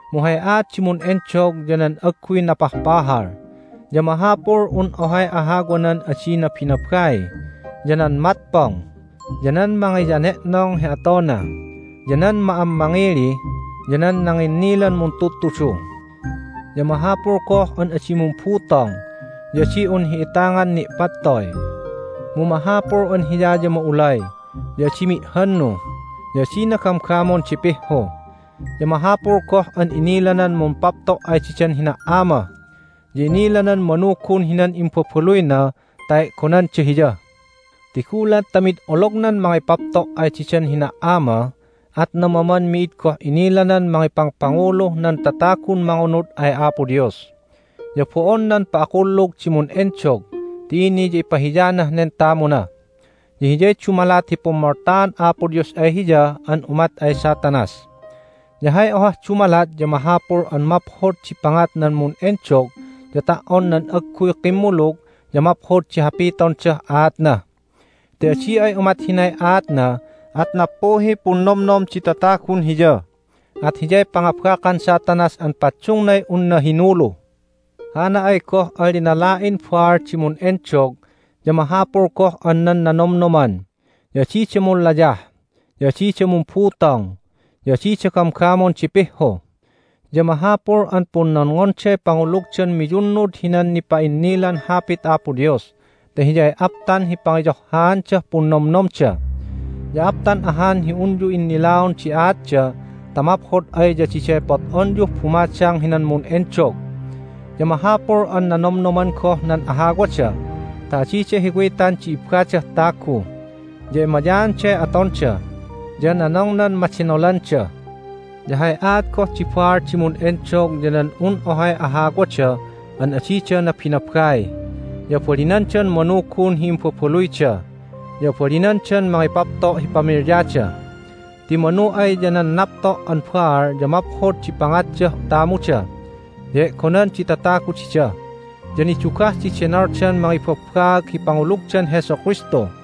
Mu hay aat di mun'endog ya nan agguy napahpahal, ya mahapul un ohay ahawanan adi nabinabai, ya nan matpong, ya nan mangiyane'nong hi atona, ya nan ma'ammangili, ya nan nanginnilan muntudtudu. Ya mahapul goh an adi mumbutong, ya adi un hi'itangan ni'pattoy, mu mahapul an hiya ya ma'ulay, ya adi mi'hannu, ya adina gamgamon di pihhu. Ya mahapul goh an inilanan mumpapto' ay didan hina"ama, ya inilanan manugun hinan imbabaluyna ta e'gonanda hiya. (Ti gulat ta mid olognan mangipapto' ay didan hina"ama at namaman mi'id goh inilanan mangipangpanguluh nan tatagun mangunud ay Apo Dios.) Ya bo'on nan pa'akkulug di mun'endog ti ini ya ipahiyanah nen tamuna, ya hiyay dumalat hi pummoltaan Apo Dios ay hiya an umat ay Satanas. Ya hay ohah dumalat ya mahapul an maphod di pangat nan mun'endog ya ta"on nan agguy kimmulug ya maphod di hapitondah aatna. Ti adi ay umat hinay aatna at nappuhiy punnomnom di tatagun hiya, at hiyay pangabakan Satanas an paddungnay unna hinulu. Hana ay goh an linala'in baal di mun'endog ya mahapul goh an nan nanomnoman, ya adida munlayah, ya adida mumbutong, ya adida gamgamon di pihhu. Ya mahapul an punnonngonday pangulugdan miyunnud hinan nipa'innilan Hapit Apo Dios ta hiyay aptan hi pangiyohhaandah punnomnomda. Ya aptan ahan hi unyu innilaon di aatda ta maphod ay ya diday pot'onyuh bumadang hinan mun'endog. Ya mahapul an nanomnoman goh nan ahawada ta adida hiwitan di ibbadah tagu, ya emayaanday atonda, ya nanongnan madenolanda. Ya hay aat goh di baal di mun'endog ya nan un ohay ahawada an adida nabinabai, ya abalinandan manugun hi imbabaluyda, ya abalinandan mangipapto' hi pamilyada. Ti manu ay ya nan napto' an baal ya maphod di pangatdah tamuda ya e'gonan di tatagu dida. Ya nidugah di denoldan mangibabbaag hi pangulugdan Jesu Kristu.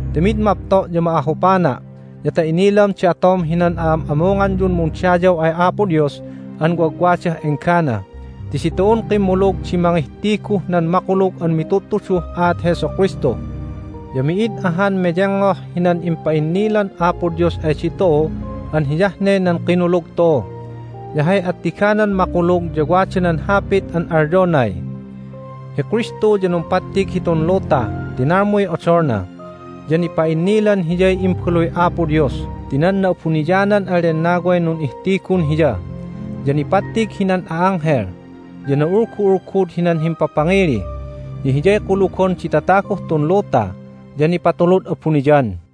ti mid mapto' ya ma'ahupana' ya ta inilam di atom hinan a'am'amunganyun mundayaw ay Apo Dios an wagwadah enggana ti ditu'un kimmulug di mangihtiguh nan makulug an mitudtuduh aat Jesu Kristu. Ya mi'id ahan meyengngoh hinan impa'innilan Apo Dios ay ditu'u an hiyah ne nan kinulug tu'u. Ya hay attiganan makulug ya wada nan hapit an alyonay, "Hi Kristu ya numpattig hitun luta ti nalmuy odolna, ya nipa'innilan Hiyay Imbaluy Apo Dios ti nan Na'abuniyanan an Lennaway nun'ihtigun Hiya. Ya nipattig hinan a'anghel, ya na'ulgu'ulgud hinan himpapangili, ya Hiyay kulugon di tataguh tun luta, ya nipatulud abuniyan."